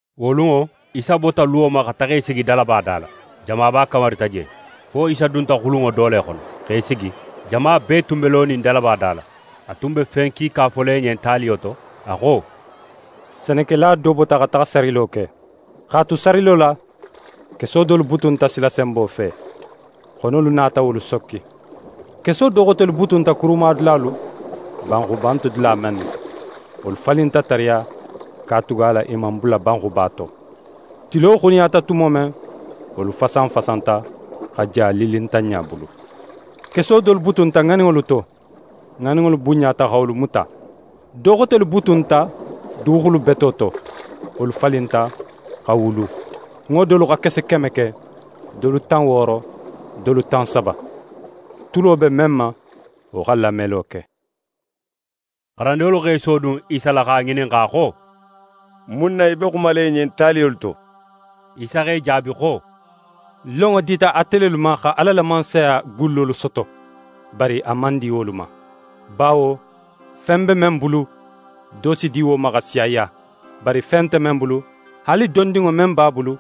Wo lunŋo, Isa bota luwo ma xa taxa í sigi dalaba da la. Jamaba kamarita je, fo Isa dunta xulunŋo do le xono, x'é sigi. Jama bee tun be lonin dalaba da la. A tun be fen kiika fola i ɲen taliyolu to, a xo: «Senekela do bota xa taxa sarilo ke. X'a tu sarilo la, keso dolu butunta silasenbo fe. Xonolu nata wolu sokki. Keso do xotelu butunta kurumadulalu, banxuba nte dula mennu. Wolu falinta tariya, katugala i man bula banxuba to. Tilo xuniyata tumo men, wolu fasanfasanta, xa ja lillintanɲa bulu. Keso dolu butunta ŋaninŋolu to, ŋaninŋolu bunɲata xa wolu muta. Do xotelu butunta duguxulu beto to. Wolu falinta, xa wulu. Kunŋo dolu xa kese keme ke, dolu tan wooro, dolu tan saba. Tulo be men ma, wo xa lamelo ke!» xarandinŋolu x'e sodun Isa la x'a ŋininxa xo: «Mun na í be xumala i ɲen taliyolu to?» Isa x'e jaabi xo: «Lonŋo dita ate lelu ma xa Ala la Mansaya gullolu soto, bari a man di wolu ma. Bawo fen be men bulu, do si di wo ma x'a siyaya, bari fen nte men bulu, haali dondinŋo men b'a bulu,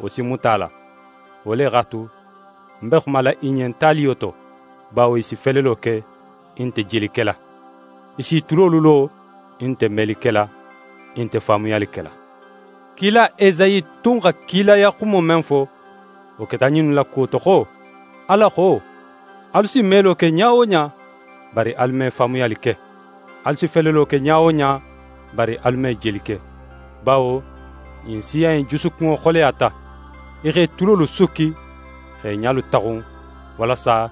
wo si muta a la. Wo le x'a tu, ń be xumala i ɲen taliyo to; bawo i si felelo ke, i nte jeli kela; i s'i tulolu lo, i nte meli kela, i nte faamuyali kela. Kila Esayi tun xa kilaya xumo men fo, wo keta ɲinnu la kuwo to xo: Ala xo: “Alu si melo ke ɲa wo ɲa, bari alu me faamuyali ke. Alu si felelo ke ɲa wo ɲa, bari alu me jeli ke. Bawo ɲin siya in jusukunŋo xoleyata, i x'e tulolu sukki x'e ɲalu taxun, walasa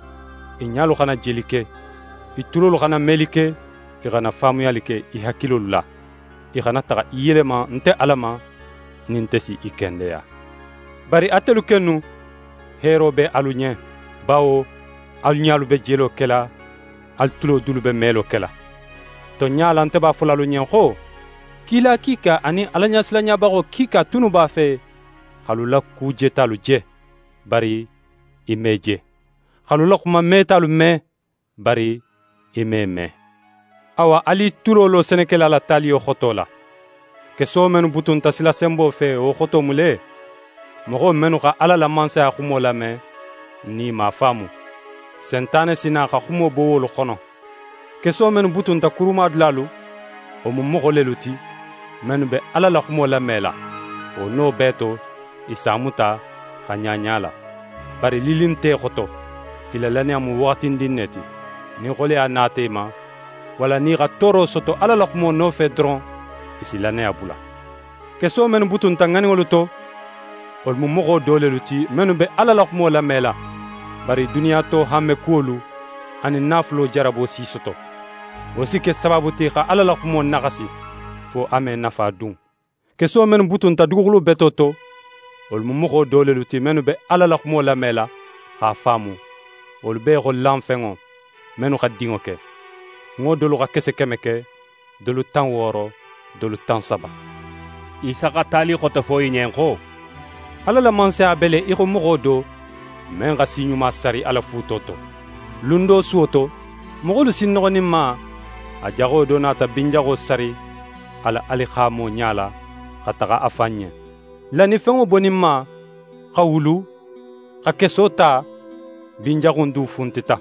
i ɲalu xana jeli ke, i tulolu xana meli ke, i xana faamuyali ke i hakilolu la, i xana taxa i yelema nte Ala ma, nin nte si i kendeya.” «Bari atelu kennu, heero be alu ɲen; bawo alu ɲalu be jelo kela, alu tulo dulu be melo kela. Tonɲa la, nte b'a fola alu ɲen xo, kila kiika anin Alaɲasilanɲabaxo kiika tunnu b'a fe x'alu la ku jetalu je, bari i man i je; x'alu la xuma metalu me, bari i man i me.» «Awa, alu i tulo lo senekela la taliyo xoto la. Keso mennu butunta silasenbo fe, wo xoto mu le: Moxo mennu xa Ala la Mansaya xumo lame, nin i man a faamu, Sentane si na xa xumo bo wolu xono. Keso mennu butunta kurumadulalu, wo mu moxo lelu ti, mennu be Ala la xumo lamela, wo no bee to, i s'a muta, xa ɲaɲa a la. Bari lilli nte i xoto, i la lannaya mu waxatindin ne ti. Nin xoleya nata i ma, walla nin i xa tooro soto Ala la xumo nofe doron, i si lannaya bula. Keso mennu butunta ŋaninŋolu to, wolu mu moxo do lelu ti, mennu be Ala la xumo lamela, bari duniya to hanmekuwolu anin naafulo jarabo si i soto. Wo si ke sabaabu ti xa Ala la xumo naxasi, fo a me nafa dun. Keso mennu butunta duguxulu beto to, wolu mu moxo do lelu ti, mennu be Ala la xumo lamela, x'a faamu. Wolu be í xo lanfenŋo, mennu xa dinŋo ke. Kunŋo dolu xa kese keme ke, dolu tan wooro, dolu tan saba.» Isa xa tali xote fo i ɲen xo: «Ala la Mansaya be le í xo moxo do, men xa si ɲuma sari a la fuuto to. Lun do suwo to, moxolu sinnoxoninma, a jaxo do nata bin jaxo sari a la alixaamo ɲala, xa taxa a fan ɲen. Lannifenŋo boninma, xa wulu, xa keso ta, bin jaxu in du funtita.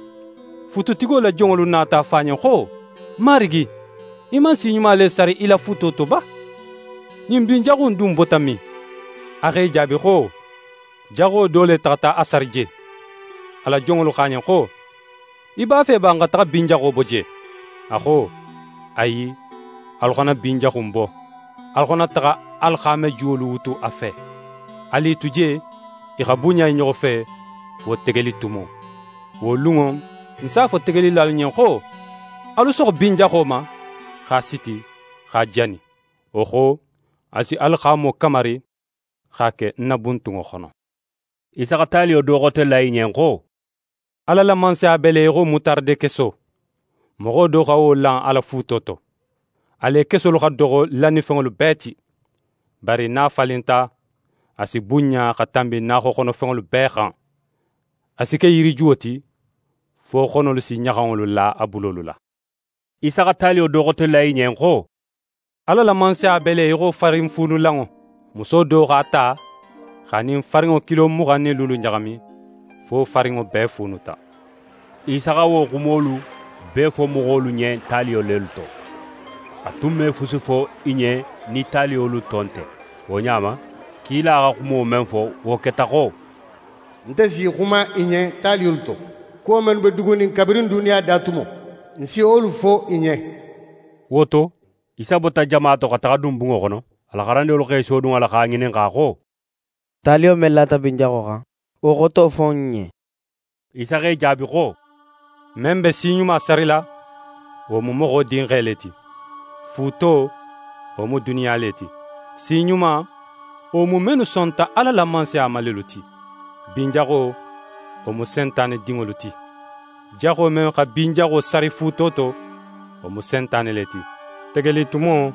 Fuututigo la jonŋolu nata a fo a ɲen xo: “Marigi, í man si ɲuma le sari í la fuuto to ba? Ɲin bin jaxu in dun bota min?” A x'e jaabi xo: “Jaxo do le taxata a sari je.” A la jonŋolu xo a ɲen xo: “Í b'a fe ba n xa taxa bin jaxo bo je?” A xo: “Ayi, alu xana bin jaxu in bo, alu xana taxa alixaamajuwolu wutu a fe. Alu i tu je, i xa bunɲa i ɲoxo fe fo tegelitumo. Wo lunŋo, ń s'a fo tegelilalu ɲen xo: Alu soxo bin jaxo ma, x'a siti, x'a jani. Wo xo, alu si alixaamo kamari x'a ke ń na buntunŋo xono”.» Isa xa taliyo do xote la i ɲen xo: «Ala la Mansaya be le í xo mutaradekeso. Moxo do xa wo lan a la fuuto to. A le kesolu xa doxo lannifenŋolu bee ti. Bari nin a falinta, a si bunɲa xa tanbi naaxoxonofenŋolu bee xan. A si ke yirijuwo ti, fo xonolu si ɲaxanŋolu la a bulolu la.» Isa xa taliyo do xote la i ɲen xo: «Ala la Mansaya be le í xo farinfuunulanŋo. Muso do x'a ta x'a nin farinŋo kilo muxan nin luulu ɲaxami, fo farinŋo bee fuunuta.» Isa xa wo xumolu bee fo moxolu ɲen taliyo lelu to. A tun me fusi fo i ɲen nin taliyolu to nte. Wo ɲa ma, kila xa xumo men fo, wo keta xo: «Nte si xuma i ɲen taliyolu to. Kuwo men tunnu be dugunin kabirin duniya da tumo, ń si wolu fo i ɲen.» Wo to, Isa bota jama to xa taxa dun bunŋo xono. A la xarandinŋolu x'e sodun a la x'a ŋininxa xo: «Taliyo men lata bin jaxo xan, wo xoto fo n ɲen.» Isa x'e jaabi xo: «Men be si ɲuma sarila, wo mu Moxo Dinxe le ti. Fuuto, wo mu duniya le ti. Si ɲuma, wo mu mennu sonta Ala la Mansaya ma lelu ti. Bin jaxo, wo mu Sentane dinŋolu ti. Jaxo men xa bin jaxo sari fuuto to, wo mu Sentane le ti. Tegelitumo,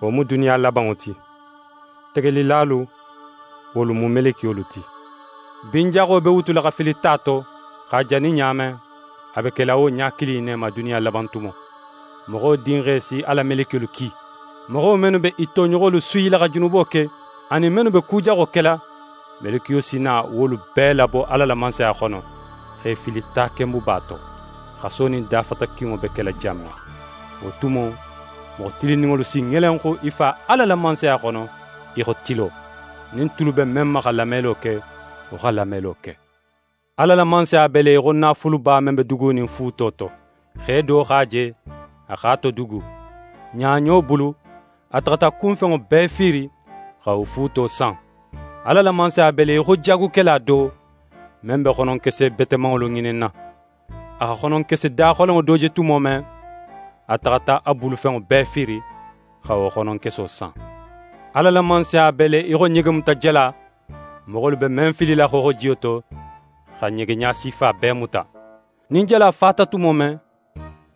wo mu duniya labanŋo ti. Tegelilalu, wolu mu melekiyolu ti. Bin jaxo be wutula xa fili ta to, x'a jani ɲa men, a be kela wo ɲa kilin in ne ma duniya laban tumo. Moxo Dinxe si a la melekiyolu ki. Moxo mennu be i toɲoxolu suyila xa junubo ke, anin mennu be ku jaxo kela, melekiyolu si na wolu bee labo Ala la Mansaya xono, x'e fili takenbuba to, xaso nin dafatakinŋo be kela jan men. Wo tumo, moxo tilinninŋolu si ŋelenxu i Fa Ala la Mansaya xono í xo tilo. Nin tulu be men ma xa lamelo ke, wo xa lamelo ke! «Ala la Mansaya be le í xo naafuluba men be dugunin fuuto to. Xe do x'a je, a x'a todugu. Ɲaɲo bulu, a taxata a kunfenŋo bee fiiri, xa wo fuuto san. «Ala la Mansaya be le í xo jaagukela do, men be xononkese betemanŋolu ŋininna. A xa xononkese daxolenŋo do je tumo men, a taxata a bulufenŋo bee fiiri, xa wo xononkeso san. «Ala la Mansaya be le í xo ɲegemutajala, moxolu be men filila xooxojiyo to xa ɲege ɲasifa bee muta. Nin jala fata tumo men,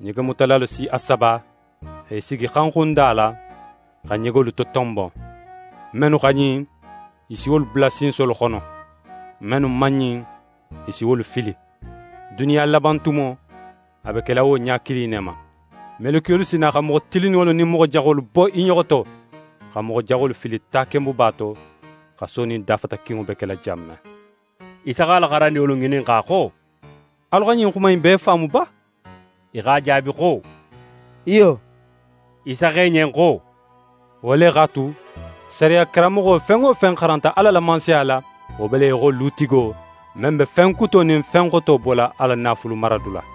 ɲegemutalalu si a saba x'e sigi xanxunda la, xa ɲegolu totonbon. Mennu xa ɲin, i si wolu bula sinsolu xono; mennu man ɲin, i si wolu fili. Duniya laban tumo, a be kela wo ɲa kilin in ne ma. Melekiyolu si na xa moxo tilinninŋolu nin moxo jaxolu bo i ɲoxo to, xa moxo jaxolu fili takenbuba to, xaso nin dafatakinŋo be kela jan men.» Isa x'a la xarandinŋolu ŋininxa xo: «Alu xa ɲin xuma innu bee faamu ba?» I x'a jaabi xo: «Iyo.» Isa xo i ɲen xo: «Wo le x'a tu, sariya karanmoxo fen wo fen xaranta Ala la Mansaya la, wo be le í xo lutigo, men be fen kuto nin fen xoto bola a la naafulu maradula.»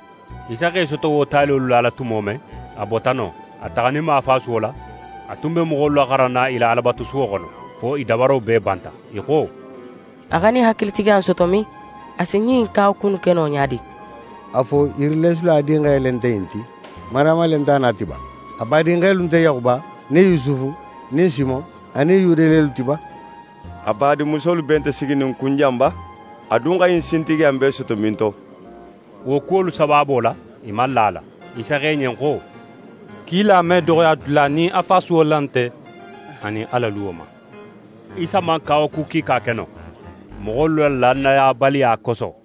Isa x'é soto wo taliyolu lala tumo men, a bota non. A taxaninma a fasuwo la, a tun be moxolu laxaranna i la Alabatusuwo xono, fo i dabaro bee banta, i xo: «A xa ɲin hakilitigiya in soto min? A si ɲin kawaku innu ke no ɲa di? A fo yirileesula dinxe le nte ɲin ti? Mariyama le nte a na ti ba? A badinxelu nte Yaxuba nin Yusufu nin Simon anin Yude lelu ti ba? A badinmusolu bee nte siginin n kun jan ba? A dun xa ɲin sintigiya in bee soto minto?» Wo kuwolu sabaabo la, i man la a la. Isa xo i ɲen xo: «Kila me doxoya dula, nin a fasuwo la nte, anin a la luwo ma.» Isa man kawaku kiika ke non, moxolu la lannayabaliya koso.